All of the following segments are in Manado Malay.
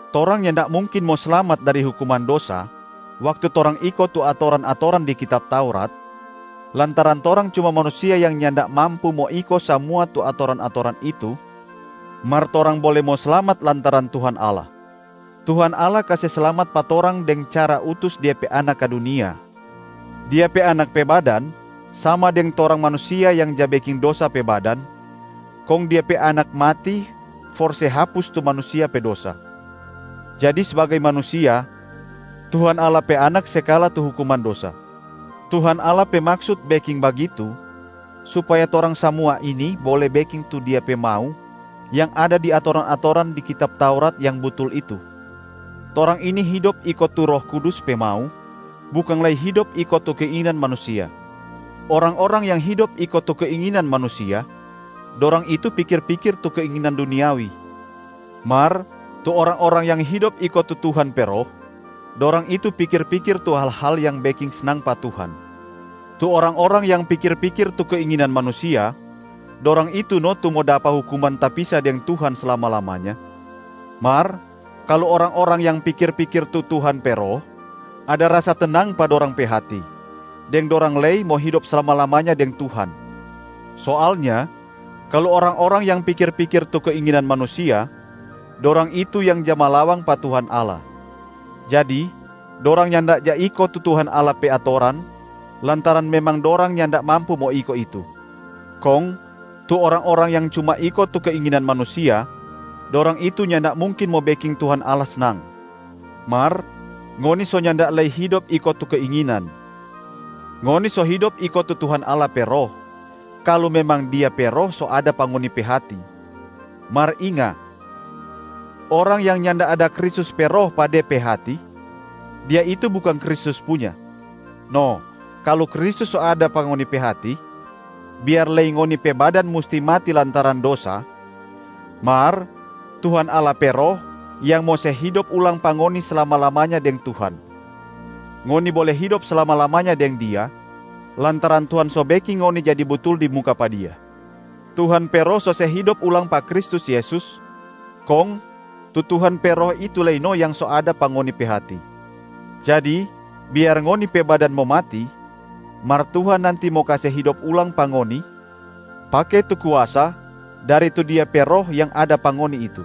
Torang nyanda mungkin mo slamat dari hukuman dosa waktu torang iko tu atoran-atoran di kitab Taurat, lantaran torang cuma manusia yang nyanda mampu mo iko samua tu atoran-atoran itu, mar torang bole mo slamat lantaran Tuhan Allah. Tuhan Allah kase slamat pa torang deng cara utus Dia pe Anak ka dunia. Dia pe Anak pe badan sama deng torang manusia yang ja beking dosa pe badan, kong Dia pe Anak mati for se hapus tu manusia pe dosa. Jadi sbagai manusia, Tuhan Allah pe Anak se kala tu hukuman dosa. Tuhan Allah pe maksut beking bagitu supaya torang samua ini bole beking tu Dia pe mau yang ada di atoran-atoran di kitab Taurat yang butul itu. Torang ini hidop iko tu Roh Kudus pe mau, bukang lei hidop iko tu keinginan manusia. Orang-orang yang hidop iko tu keinginan manusia, dorang itu pikir-pikir tu keinginan duniawi. Mar tu orang-orang yang hidop iko tu Tuhan pe Roh, dorang itu pikir-pikir tu hal-hal yang beking snang pa Tuhan. Tu orang-orang yang pikir-pikir tu keinginan manusia, dorang itu no tu mo dapa hukuman tapisa deng Tuhan slama-lamanya. Mar kalu orang-orang yang pikir-pikir tu Tuhan pe Roh, ada rasa tenang pa dorang pe hati, deng dorang lei mo hidop slama-lamanya deng Tuhan. Soalnya kalu orang-orang yang pikir-pikir tu keinginan manusia, dorang itu yang ja malawang pa Tuhan Allah. Jadi dorang nyanda ja iko tu Tuhan Allah pe atoran lantaran memang dorang nyanda mampu mo iko itu. Kong tu orang-orang yang cuma iko tu keinginan manusia, dorang itu nyanda mungkin mo beking Tuhan Allah snang. Mar ngoni so nyanda lei hidop iko tu keinginan. Ngoni so hidop iko tu Tuhan Allah pe Roh kalu memang Dia pe Roh so ada pa ngoni pe hati. Mar inga, orang yang nyanda ada Kristus pe Roh pa de pe hati, dia itu bukang Kristus punya. No kalu Kristus so ada pa ngoni pe hati, biar lei ngoni pe badan musti mati lantaran dosa mar Tuhan Allah pe Roh yang mo se hidop ulang pa ngoni slama-lamanya deng Tuhan. Ngoni bole hidop slama-lamanya deng Dia lantaran Tuhan so beking ngoni jadi butul di muka pa Dia. Tuhan pe Roh so se hidop ulang pa Kristus Yesus kong tu Tuhan pe Roh itu lei no yang so ada pa ngoni pe hati. Jadi biar ngoni pe badan mo mati mar Tuhan nanti mo kase hidop ulang pa ngoni pake tu kuasa dari tu Dia pe Roh yang ada pa ngoni itu.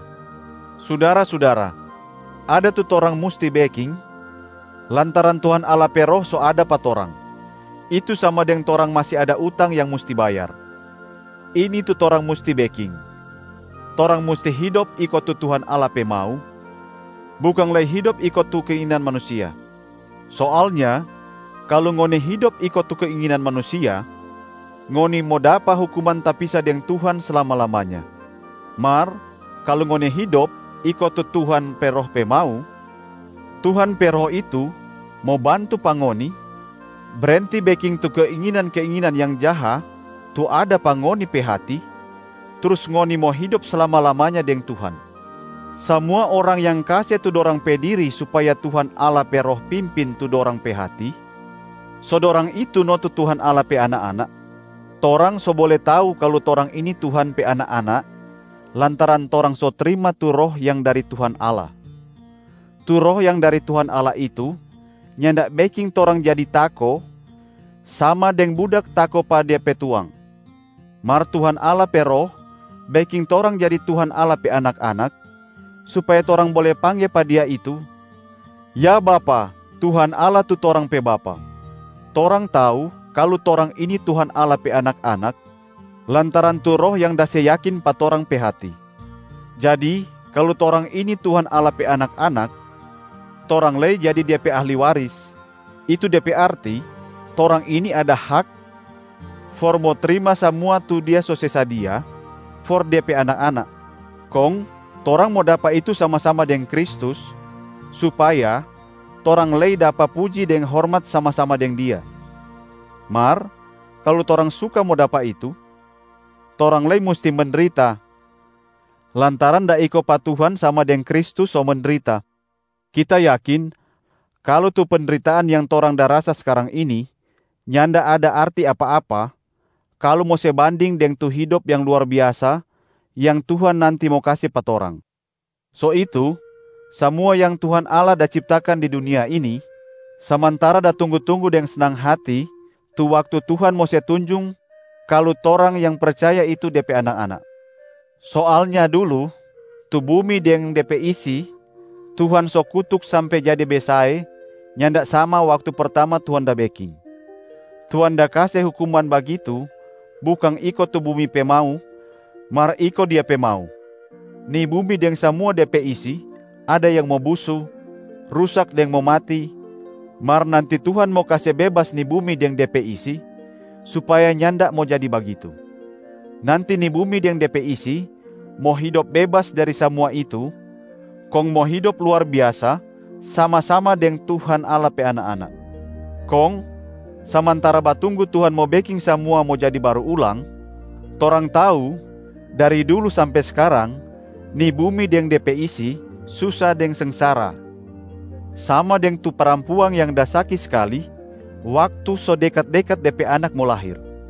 Sudara-sudara, ada tu torang musti beking lantaran Tuhan Allah pe Roh so ada pa torang. Itu sama deng torang masi ada utang yang musti bayar. Ini tu torang musti beking: torang musti hidop iko tu Tuhan Allah pe mau, bukang lei hidop iko tu keinginan manusia. Soalnya kalu ngoni hidop iko tu keinginan manusia, ngoni mo dapa hukuman tapisa deng Tuhan slama-lamanya. Mar kalu ngoni hidop iko tu Tuhan pe Roh pe mau, Tuhan pe Roh itu mo bantu pa ngoni brenti beking tu keinginan-keinginan yang jaha tu ada pa ngoni pe hati, trus ngoni mo hidop slama-lamanya deng Tuhan. Samua orang yang kase tu dorang pe diri supaya Tuhan Allah pe Roh pimpin tu dorang pe hati, so dorang itu no tu Tuhan Allah pe anak-anak. Torang so bole tau kalu torang ini Tuhan pe anak-anak lantaran torang so trima tu Roh yang dari Tuhan Allah. Tu Roh yang dari Tuhan Allah itu nyanda beking torang jadi tako sama deng budak tako pa de pe tuang. Mar Tuhan Allah pe Roh beking torang jadi Tuhan Allah pe anak-anak, supaya torang bole pangge pa Dia itu, “Ya Bapa, Tuhan Allah tu torang pe Bapa!”. Torang tau kalu torang ini Tuhan Allah pe anak-anak lantaran tu Roh yang da se yakin pa torang pe hati. Jadi kalu torang ini Tuhan Allah pe anak-anak, torang lei jadi Dia pe ahli waris, itu de pe arti torang ini ada hak for mo trima samua tu Dia so se sadia for De pe anak-anak. Kong torang mo dapa itu sama-sama deng Kristus supaya torang lei dapa puji deng hormat sama-sama deng Dia. Mar kalu torang suka mo dapa itu, torang lei musti mendrita lantaran da iko pa Tuhan sama deng Kristus so mendrita. Kita yakin kalu tu pendritaan yang torang da rasa skarang ini nyanda ada arti apa-apa kalu mo se banding deng tu hidop yang luar biasa yang Tuhan nanti mo kase pa torang. So itu, samua yang Tuhan Allah da ciptakan di dunia ini samantara da tunggu-tunggu deng snang hati tu waktu Tuhan mo se tunjung kalu torang yang percaya itu De pe anak-anak. Soalnya dulu tu bumi deng de pe isi Tuhan so kutuk sampe jadi besae nyanda sama waktu pertama Tuhan da beking. Tuhan da kase hukuman bagitu bukang iko tu bumi pe mau, mar iko Dia pe mau. Ni bumi deng samua de pe isi ada yang mo busu, rusak deng mo mati, mar nanti Tuhan mo kase bebas ni bumi deng de pe isi supaya nyanda mo jadi bagitu. Nanti ni bumi deng de pe isi mo hidop bebas dari samua itu kong mo hidop luar biasa sama-sama deng Tuhan Allah pe anak-anak. Kong samantara batunggu Tuhan mo beking samua mo jadi baru ulang, torang tau dari dulu sampe skarang ni bumi deng de pe isi susa deng sengsara, sama deng tu parampuang yang da saki skali waktu so dekat-dekat de pe anak mo lahir.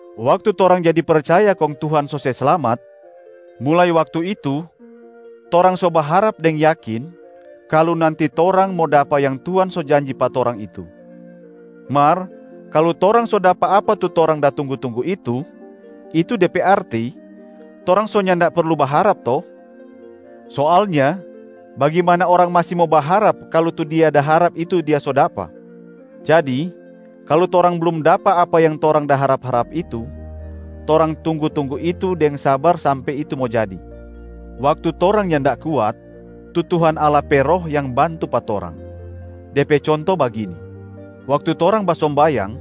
Waktu torang jadi percaya kong Tuhan so se slamat, mulai waktu itu torang so baharap deng yakin kalu nanti torang mo dapa yang Tuhan so janji pa torang itu. Mar kalu torang so dapa apa tu torang da tunggu-tunggu itu, itu de pe arti torang so nyanda perlu baharap to? Soalnya bagimana orang masi mo baharap kalu tu dia da harap itu dia so dapa? Jadi, kalu torang blum dapa apa yang torang da harap-harap itu, torang tunggu-tunggu itu deng sabar sampe itu mo jadi. Waktu torang nyanda kuat, tu Tuhan Allah pe Roh yang bantu pa torang. De pe conto bagini: waktu torang basombayang,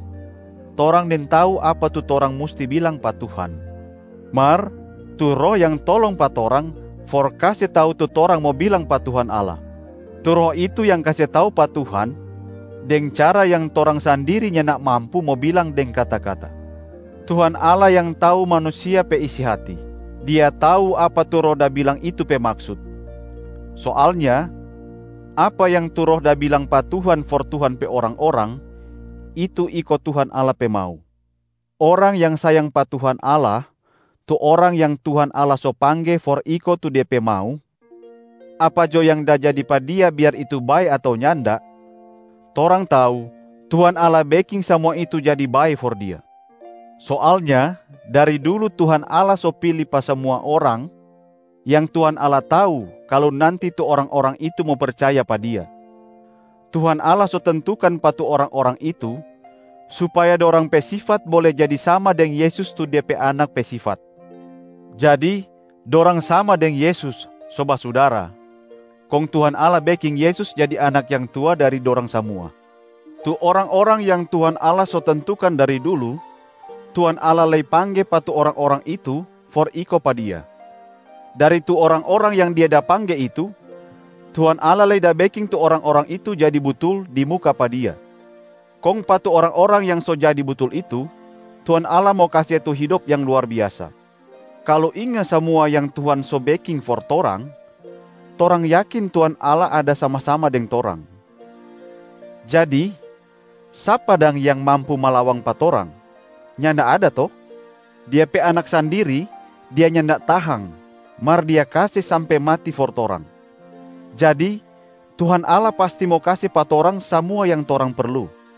torang nintau apa tu torang musti bilang pa Tuhan, mar tu Roh yang tolong pa torang for kase tau tu torang mo bilang pa Tuhan Allah. Tu Roh itu yang kase tau pa Tuhan deng cara yang torang sandiri nyanda mampu mo bilang deng kata-kata. Tuhan Allah yang tau manusia pe isi hati, Dia tau apa tu Roh da bilang itu pe maksut. Soalnya apa yang tu Roh da bilang pa Tuhan for Tuhan pe orang-orang, itu iko Tuhan Allah pe mau. Orang yang sayang pa Tuhan Allah, tu orang yang Tuhan Allah so pangge for iko tu De pe mau, apa jo yang da jadi pa dia biar itu bae ato nyanda, torang tau Tuhan Allah beking samua itu jadi bae for dia. Soalnya dari dulu Tuhan Allah so pili pa samua orang yang Tuhan Allah tau kalu nanti tu orang-orang itu mo percaya pa Dia. Tuhan Allah so tentukan pa tu orang-orang itu supaya dorang pe sifat bole jadi sama deng Yesus tu De pe Anak pe sifat. Jadi dorang sama deng Yesus so basudara, kong Tuhan Allah beking Yesus jadi Anak yang tua dari dorang samua. Tu orang-orang yang Tuhan Allah so tentukan dari dulu, Tuhan Allah lei pangge pa tu orang-orang itu for iko pa Dia. Dari tu orang-orang yang Dia da pangge itu, Tuhan Allah lei da beking tu orang-orang itu jadi butul di muka pa Dia. Kong pa tu orang-orang yang so jadi butul itu, Tuhan Allah mo kase tu hidop yang luar biasa. Kalu inga samua yang Tuhan so beking for torang, torang yakin Tuhan Allah ada sama-sama deng torang. Jadi sapa dang yang mampu malawang pa torang? Nyanda ada to? Dia pe Anak sandiri, Dia nyanda tahang mar Dia kase sampe mati for torang. Jadi Tuhan Allah pasti mo kase pa torang samua yang torang perlu.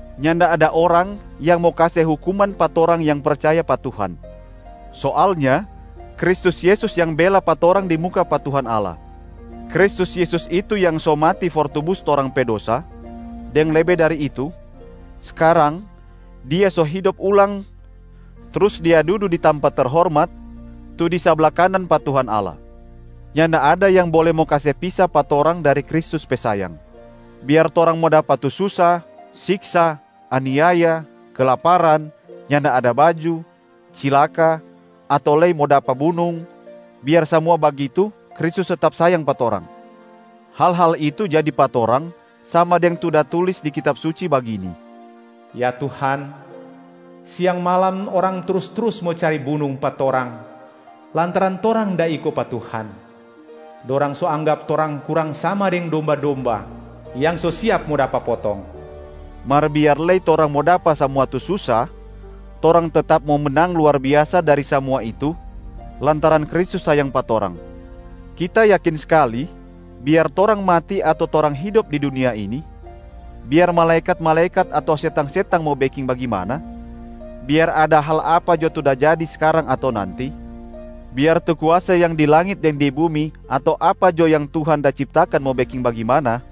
Nyanda ada orang yang mo kase hukuman pa torang yang percaya pa Tuhan. Soalnya Kristus Yesus yang bela pa torang di muka pa Tuhan Allah. Kristus Yesus itu yang so mati for tubus torang pe dosa, deng lebe dari itu, skarang Dia so hidop ulang trus Dia dudu di tampa terhormat tu di sabla kanan pa Tuhan Allah. Nyanda ada yang bole mo kase pisa pa torang dari Kristus pe sayang. Biar torang mo dapa tu susa, siksa, aniaya, kelaparan, nyanda ada baju, cilaka ato lei mo dapa bunung, biar samua bagitu Kristus tetap sayang pa torang. Hal-hal itu jadi pa torang sama deng tu da tulis di Kitab Suci bagini: “Ya Tuhan, siang malam orang trus-trus mo cari bunung pa torang lantaran torang da iko pa Tuhan, dorang so anggap torang kurang sama deng domba-domba yang so siap mo dapa potong.” Mar biar lei torang mo dapa samua tu susa, torang tetap mo menang luar biasa dari samua itu lantaran Kristus sayang pa torang. Kita yakin skali biar torang mati ato torang hidop di dunia ini, biar malaekat-malaekat ato setang-setang mo beking bagimana, biar ada hal apa jo tu da jadi skarang ato nanti, biar tu kuasa yang di langit deng di bumi ato apa jo yang Tuhan da ciptakan mo beking bagimana,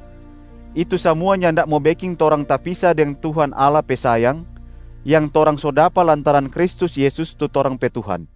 itu samua nyanda mo beking torang tapisa deng Tuhan Allah pe sayang yang torang so dapa lantaran Kristus Yesus tu torang pe Tuhan.